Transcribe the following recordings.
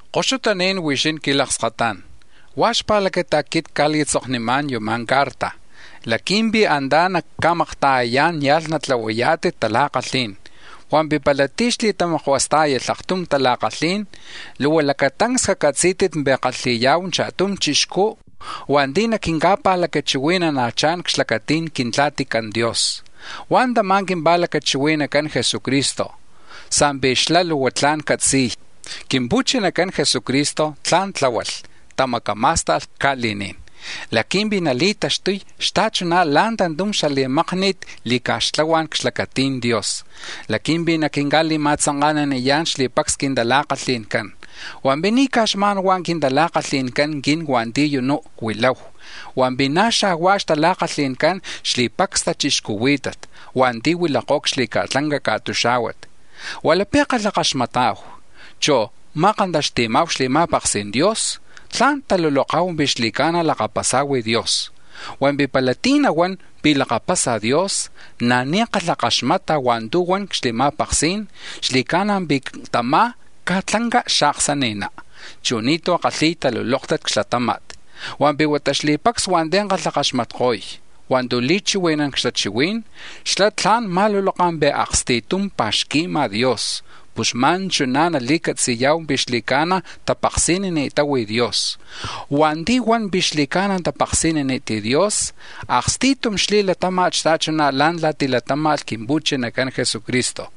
Koxutaní̱n huixín quilakskatá̱n, huá̱ xpa̱lacata̱ quit cca̱li̱tzoknimá̱n yuma̱ quincarta laqui̱mpi̱ antá̱ nacca̱makta̱yayá̱n nia̱lh natlahuayá̱tit tala̱kalhí̱n. Hua̱mpi̱ pala tí̱ xli̱tamakuastá̱yalh aktum tala̱kalhí̱n, luhua lacatancs cacatzí̱tit pi̱ kalhi̱ya̱hu cha̱tum chixcú̱ hua̱nti̱ naquinca̱pa̱lacachihui̱nana̱chá̱n c-xlacati̱n Quintla̱tican Dios, huá̱ tama̱ quimpa̱lacachihui̱nacán Jesucristo, sa̱mpi̱ xlá̱ luhua tla̱n catzi̱y. Quimpu̱chinacan Jesucristo tla̱n tláhualh, tamacamá̱sta̱lh ca̱li̱ní̱n laqui̱mpi̱ nali̱taxtuy xta̱chuná̱ la̱ tantum xali̱makni̱t li̱ca̱xtlahuá̱n c-xlacati̱n Dios laqui̱mpi̱ naquinca̱li̱ma̱tzanka̱naniyá̱n xli̱pacs quintala̱kalhi̱ncán, hua̱mpi̱ ni̱ caj xma̱n hua̱ quintala̱kalhi̱ncan quin hua̱nti̱ u̱nú̱ huilahu, hua̱mpi̱ na̱ xa̱huá̱ xtala̱kalhi̱ncán xli̱pacs tachixcuhuí̱tat hua̱nti̱ huilakó̱ c-xli̱ca̱tlanca ca̱tuxá̱huat. Hua̱ lapi̱ kalhakaxmata̱hu, chu̱ ma̱kantaxti̱ma̱hu xli̱ma̱paksi̱n Dios, tla̱n taluloka̱hu pi̱ xli̱ca̱na̱ lakapasa̱hu Dios. Hua̱mpi̱ pala tí̱ nahuán pi̱ lakapasa̱ Dios na̱ ni̱ kalhakaxmata̱ hua̱ntu̱ huan c-xli̱ma̱paksí̱n, xli̱ca̱na̱ pi̱ tamá̱ caj tlanca xaaksani̱ná, chu̱ ni̱tú̱ kalhi̱y talulóktat c-xlatáma̱t. Hua̱mpi̱ huata xli̱pacs hua̱nti̱ kalhakaxmatko̱y hua̱ntu̱ li̱chihui̱nán c-xtachihuí̱n, xlá̱ tla̱n ma̱luloka̱ pi̱ aksti̱tum pa̱xqui̱ma̱ Dios, pus xma̱n chuná̱ nali̱catziya̱hu pi̱ xli̱ca̱na̱ tapaksi̱nini̱tahu Dios. Hua̱nti̱ huan pi̱ xli̱ca̱na̱ tapaksi̱nini̱t Dios, aksti̱tum xli̱latáma̱t xta̱chuná̱ la̱ntla̱ tilatáma̱lh Quimpu̱chinacan Jesucristo.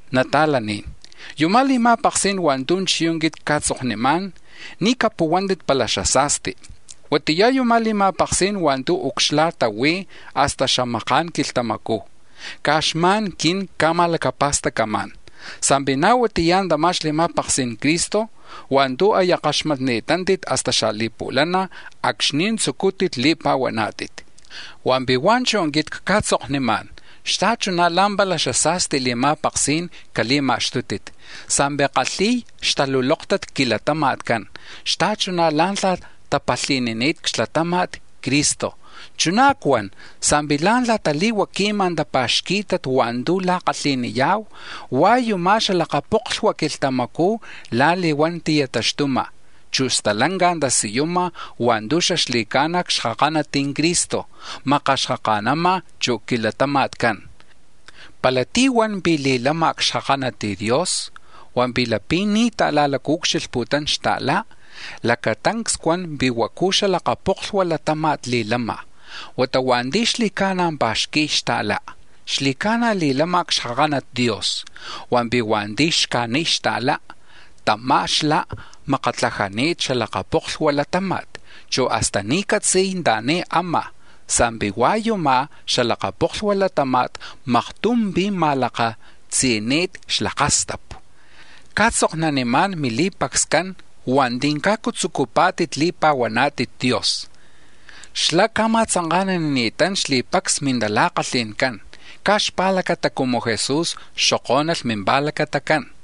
Nata̱laní̱n, yuma̱ li̱ma̱paksí̱n hua̱ntu̱ chiyú̱ quit cca̱tzoknimá̱n ni̱ capuhuántit pala xasa̱sti; huatiyá̱ yuma̱ li̱ma̱paksí̱n hua̱ntu̱ ucxla̱ta huí̱ hasta xamaka̱n quilhtamacú̱, caj xma̱n quit cca̱ma̱lacapa̱stacamá̱n sa̱mpi̱ na̱ huatiya tama̱ xli̱ma̱paksi̱n Cristo hua̱ntu̱ aya kaxpatni̱tántit hasta xali̱pu̱lana̱ acxni̱ tzucútit li̱pa̱huaná̱tit. Hua̱mpi̱ hua̱nchú̱ quit cca̱tzoknimá̱n, xta̱chuná̱ la̱mpala xasa̱sti li̱ma̱paksí̱n cali̱ma̱xtútit sa̱mpi̱ kalhi̱y xtalulóktat c-milatama̱tcán xta̱chuná̱ la̱ntla̱ tapalhí̱nilh c-xlatama̱t Cristo, chuná̱ cuan sa̱mpi̱ la̱ntla̱ tali̱huaqui̱ma̱ tapá̱xqui̱t hua̱ntu̱ la̱kalhi̱niya̱hu, hua̱ yuma̱ xalakaca̱poklhua quilhtamacú̱ la̱li̱huán ti̱taxtuma̱, chu̱ stalanca tasiyuma̱ hua̱ntu̱ xaxli̱ca̱na̱ cxkakanat Cristo makaxkaka̱nama̱ chu̱ c-milatama̱tcán. Pala tí̱ huan pi̱ li̱lama̱ cxkakanat Dios hua̱mpi̱ lapi̱ ni̱ ta̱la̱ucxilhputún xta̱lá, lacatancs cuan pi̱ huacu xalakapoklhua latáma̱t li̱lama̱. Huata hua̱nti̱ xli̱ca̱na̱ pa̱xqui̱y xta̱lá, xli̱ca̱na̱ li̱lama̱ cxkakanat Dios. Hua̱mpi̱ hua̱nti̱ xcajniy xta̱lá, tamá̱ xlá̱ makatlajani̱t xalakaca̱poklhua latáma̱t, chu̱ hasta ni̱ catzi̱y anta̱ni̱ ama̱ sa̱mpi̱ hua̱ yuma̱ xalakaca̱poklhua latáma̱t maktum pi̱ ma̱lakatzi̱ni̱t xlakastapu. Cca̱tzoknanimá̱n mili̱pacscán lactzu̱ camán hua̱nti̱ cajcu tzucupá̱tit li̱pa̱huaná̱tit Dios, xlá̱ ca̱ma̱tzanka̱nanini̱tán xli̱pacs mintala̱kalhi̱ncán caj xpa̱lacata cumu Jesús xokó̱nalh mimpa̱lacatacán.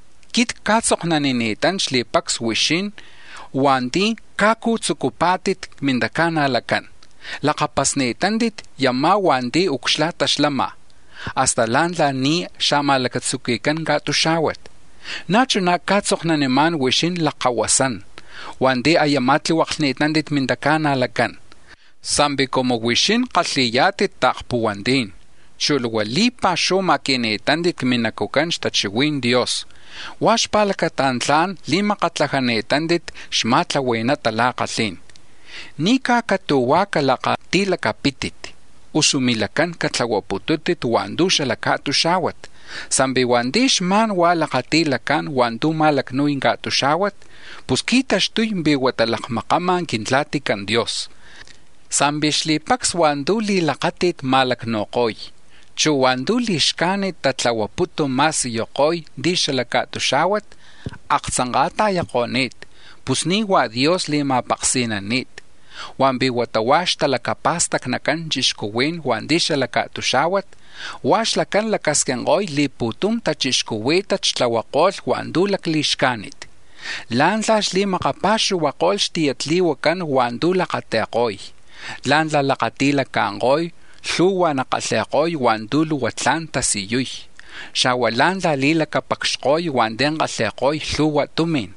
Quit cca̱tzoknanimá̱n xli̱pacs huixín hua̱nti̱ cajcu tzucuni̱tántit c-mintaca̱najlacán, sa̱mpi̱ lakapasni̱tántit yumá̱ hua̱nti̱ ucxla̱ta xlama̱ hasta la̱ntla̱ ni̱ xa̱ma̱lacatzuqui̱cán ca̱tuxá̱huat. Na̱ chuná̱ cca̱tzoknanimá̱n huixín lakkahuasán hua̱nti̱ aya ma̱tlihuaklhpá̱tit mintaca̱najlacán, sa̱mpi̱ cumu huixín kalhi̱yá̱tit ta̱kpuhuantí̱n, chu̱ luhua li̱pa̱xuhu ma̱qui̱ni̱tántit c-minacu̱cán xtachihui̱n Dios, huá̱ xpa̱lacata̱ tla̱n li̱makatlajani̱tántit xma̱tlahui̱na tala̱kalhí̱n. Ni̱ caj catu̱huá̱ calakati̱lacapítit, usu milacán catlahuaputúntit hua̱ntu̱ xala ca̱tuxá̱huat. Sa̱mpi̱ hua̱nti̱ xma̱n huá̱ lakati̱lacá̱n hua̱ntu̱ ma̱lacnu̱y ca̱tuxá̱huat, pus qui̱taxtuy pi̱ huata lakmakán Quintla̱tican Dios. Sa̱mpi̱ xli̱pacs hua̱ntu̱ li̱lakáti̱t ma̱lacnu̱ko̱y, chu̱ hua̱ntu̱ li̱xcajnit tatlahuaputu̱ ma̱siyuko̱y ti̱ xala ca̱tuxá̱huat aktzanka̱ta̱yako̱ni̱t, pus ni̱ hua̱ Dios li̱ma̱paksi̱nani̱t, hua̱mpi̱ huata huá̱ xtalacapa̱stacnican chixcuhuí̱n hua̱nti̱ xala ca̱tuxá̱huat. Hua̱ xlacán lacasquinko̱y li̱pu̱tum tachixcuhuí̱tat xtlahuako̱lh hua̱ntu̱ lacli̱xcájnit, la̱ntla̱ xli̱makapa̱xuhuako̱lh xtiyatli̱huacán hua̱ntu̱ lakati̱ko̱y, la̱ntla̱ lakati̱laca̱nko̱y lhu̱hua̱ xkalhi̱ko̱lh hua̱ntu̱ luhua tla̱n tasiyuy, xa̱huá̱ la̱ntla̱ li̱lacapacxko̱y hua̱nti̱ kalhi̱ko̱y lhu̱hua tumi̱n,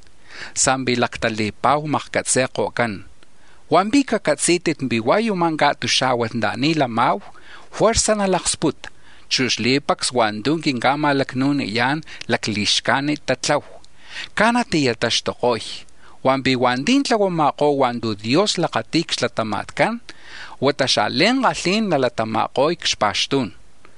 sa̱mpi̱ lactali̱pa̱hu makcatzi̱ko̱cán. Hua̱mpi̱ cacatzí̱tit pi̱ hua̱ yuma̱ ca̱tuxá̱huat anta̱ni̱ lama̱hu juerza̱ nalaksputa, chu̱ xli̱pacs hua̱ntu̱ quinca̱ma̱lacnu̱niyá̱n lacli̱xcajnit tatlahu, caj nati̱taxtuko̱y, hua̱mpi̱ hua̱nti̱ tlahuama̱kó̱ hua̱ntu̱ Dios lakati̱y c-xlatama̱tcán huata xa̱li̱ankalhi̱n nalatama̱ko̱y c-xpa̱xtú̱n.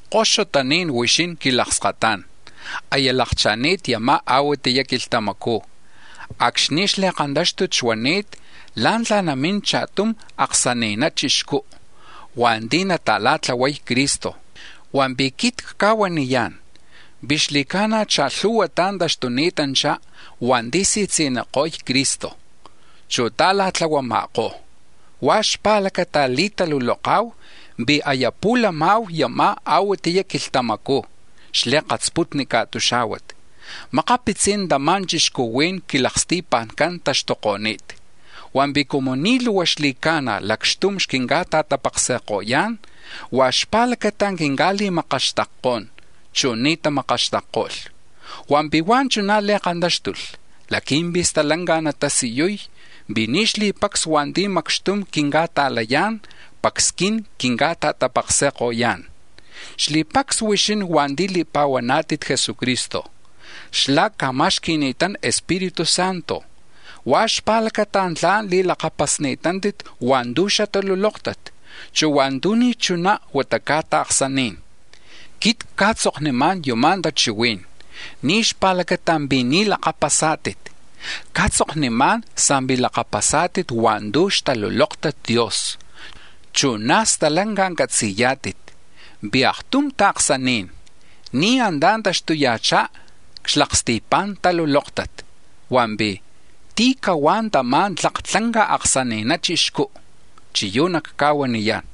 Koxutaní̱n huixín quilakskatá̱n, aya lakcha̱ni̱t yuma̱ a̱huatiya quilhtamacú̱ acxni̱ xli̱kantáxtut xuani̱t la̱ntla̱ namín cha̱tum aksani̱na chixcú̱ hua̱nti̱ nata̱la̱tlahuay Cristo, hua̱mpi̱ quit cca̱huaniyá̱n pi̱ xli̱ca̱na̱ cha̱lhu̱huatá̱ taxtuni̱tanchá̱ hua̱nti̱ si̱tzi̱niko̱y Cristo, chu̱ ta̱la̱tlahuama̱kó̱, huá̱ xpa̱lacata li̱taluloka̱hu pi̱ aya pu̱lama̱hu yuma̱ a̱huatiya quilhtamacú̱ xli̱katsputni ca̱tuxá̱huat. Makapitzi̱n tama̱ chixcuhuí̱n c-quilaksti̱pa̱ncán taxtuko̱ni̱t, hua̱mpi̱ cumu ni̱ luhua xli̱ca̱na̱ lacxtum xquinca̱ta̱tapaksi̱ko̱yá̱n huá̱ xpa̱lacata̱ quinca̱li̱makaxtakkó̱n chu̱ ni̱ tamakaxtakko̱lh. Hua̱mpi̱ huá̱ chuná̱ li̱kantáxtulh laqui̱mpi̱ stalanca̱ natasiyuy pi̱ ni̱ xli̱pacs hua̱nti̱ macxtum quinca̱ta̱layá̱n pacs quin quinca̱ta̱tapaksi̱ko̱yá̱n. Xli̱pacs huixín hua̱nti̱ li̱pa̱huaná̱tit Jesucristo, xlá̱ ca̱ma̱xqui̱ni̱tán Espíritu Santo, huá̱ xpa̱lacata tla̱n li̱lakapasá̱tit hua̱ntu̱ xtalulóktat, chu̱ hua̱ntu̱ ni̱ chuná, huata caj ta̱ksaní̱n. Quit cca̱tzoknimá̱n yuma̱ tachihuí̱n ni̱ xpa̱lacata̱ pi̱ ni̱ lakapasá̱tit, cca̱tzoknimá̱n sa̱mpi̱ lakapasá̱tit hua̱ntu̱ xtaluloktat Dios, chu̱ na̱ stalanca catzi̱yá̱tit pi̱ aktum ta̱ksaní̱n ni̱ antá̱ taxtuya̱chá̱ c-xlaksti̱pa̱n talulóktat. Hua̱mpi̱ ¿tí̱ cahuá̱ tama̱ tlak tlanca aksani̱na chixcú? Chiyú̱ nacca̱huaniyá̱n: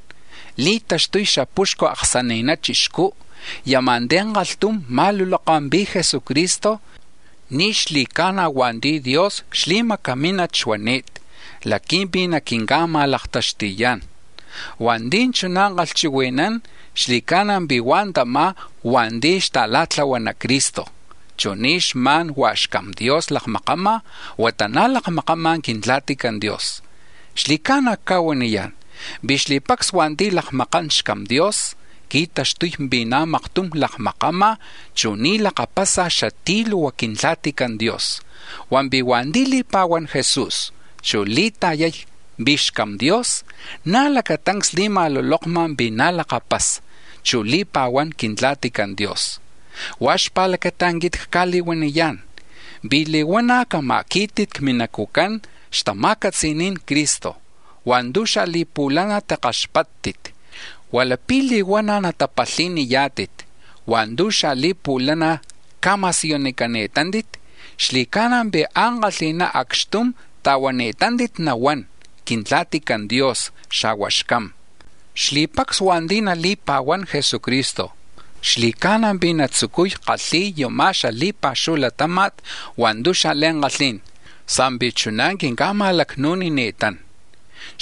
li̱taxtu̱y xapuxcu aksani̱na chixcú̱ yuma̱ ti̱ kalhtum ma̱luloka̱ pi̱ Jesucristo ni̱ xli̱ca̱na̱ hua̱nti̱ Dios xli̱macamínat xuani̱t laqui̱mpi̱ naquinca̱lakma̱xtuyá̱n. Hua̱nti̱ chuná̱ kalhchihui̱nán xli̱ca̱na̱ pi̱ hua̱ tamá̱ hua̱nti̱ xta̱la̱tlahuana Cristo, chu̱ ni̱ xma̱n hua̱ xCam Dios lakmakama̱, huata na̱ lakmakama̱ Quintla̱tican Dios. Xli̱ca̱na̱ cca̱huaniyá̱n pi̱ xli̱pacs hua̱nti̱ lakmakán xCam Dios, qui̱taxtuy pi̱ na̱ maktum lakmakama̱, chu̱ ni̱ lakapasa̱ xatí̱ luhua Quintla̱tican Dios; hua̱mpi̱ hua̱nti̱ li̱pa̱huán Jesús, chu̱ li̱ta̱yay pi̱ xCam Dios, na̱ lacatancs li̱ma̱lulokma̱ pi̱ na̱ lakapasa, chu̱ li̱pa̱huán Quintla̱tican Dios. Huá̱ xpa̱lacata̱ quit cca̱li̱huaniyá̱n pi̱ li̱huana̱ cama̱quí̱tit c-minacu̱cán xtama̱catzi̱ni̱n Cristo hua̱ntu̱ xali̱pu̱lana̱ timakkaxpáttit. Hua̱ lapi̱ li̱huana̱ natapalhi̱niyá̱tit hua̱ntu̱ xali̱pu̱lana̱ ca̱ma̱siyunicani̱tántit, xli̱ca̱na̱ pi̱ ankalhi̱ná̱ acxtum ta̱huani̱tántit nahuán Quintla̱tican Dios, xa̱hua̱ xCam. Xli̱pacs hua̱nti̱ nali̱pa̱huán Jesucristo xli̱ca̱na̱ pi̱ natzucuy kalhi̱y yuma̱ xali̱pa̱xuhu latáma̱t hua̱ntu̱ xa̱li̱ankalhí̱n, sa̱mpi̱ chuná̱ quinca̱ma̱lacnu̱nini̱tán.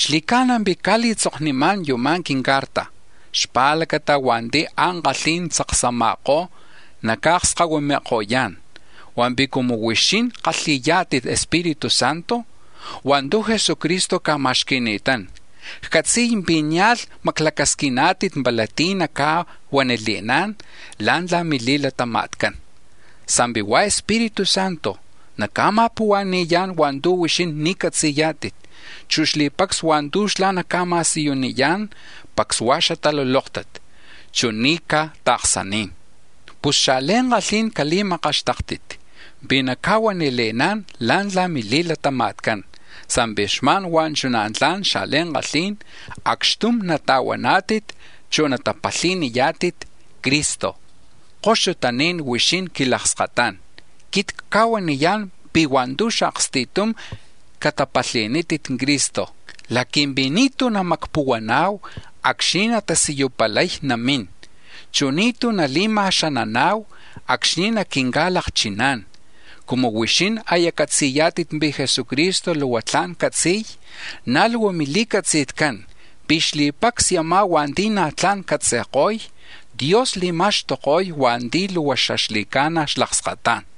Xli̱ca̱na̱ pi̱ cca̱li̱tzoknimá̱n yuma̱ quincarta xpa̱lacata̱ hua̱nti̱ ankalhí̱n tzaksama̱kó̱ naca̱akskahuimi̱ko̱yá̱n. Hua̱mpi̱ cumu huixín kalhi̱yá̱tit Espíritu Santo hua̱ntu̱ Jesucristo ca̱ma̱xqui̱ni̱tán, ccatzi̱y pi̱ nia̱lh maclacasquiná̱tit pala tí̱ naca̱huanile̱ná̱n la̱ntla̱ mili̱latama̱tcán, sa̱mpi̱ hua̱ Espíritu Santo naca̱ma̱puhua̱ni̱yá̱n hua̱ntu̱ huixín ni̱ catzi̱yá̱tit, chu̱ xli̱pacs hua̱ntu̱ xlá̱ naca̱ma̱siyuniyá̱n, pacs hua̱ xatalulóktat, chu̱ ni̱ caj ta̱ksaní̱n. Pus xa̱li̱ankalhí̱n cali̱makaxtáktit pi̱ naca̱huanile̱ná̱n la̱ntla̱ mili̱latama̱tcán, sa̱mpi̱ xma̱n hua̱ chuná̱ tla̱n xa̱li̱ankalhí̱n acxtum nata̱huaná̱tit, chu̱ natapalhi̱niyá̱tit Cristo. Koxutaní̱n huixín quilakskatá̱n, quit cca̱huaniyá̱n pi̱ hua̱ntu̱ aksti̱tum catapalhi̱nítit Cristo, laqui̱mpi̱ ni̱tú̱ namacpuhuana̱hu acxni̱ natasiyupalay namín, chu̱ ni̱tú̱ nali̱lacama̱xanana̱hu acxni̱ naquinca̱lakchiná̱n. Cumu huixín aya catzi̱yá̱tit pi̱ Jesucristo luhua tla̱n catzi̱y, na̱ luhua mili̱catzi̱tcán pi̱ xli̱pacs yumá̱ hua̱nti̱ na̱ tla̱n catzi̱ko̱y Dios li̱ma̱xtuko̱y hua̱nti̱ luhua xaxli̱ca̱na̱ xlakskatá̱n.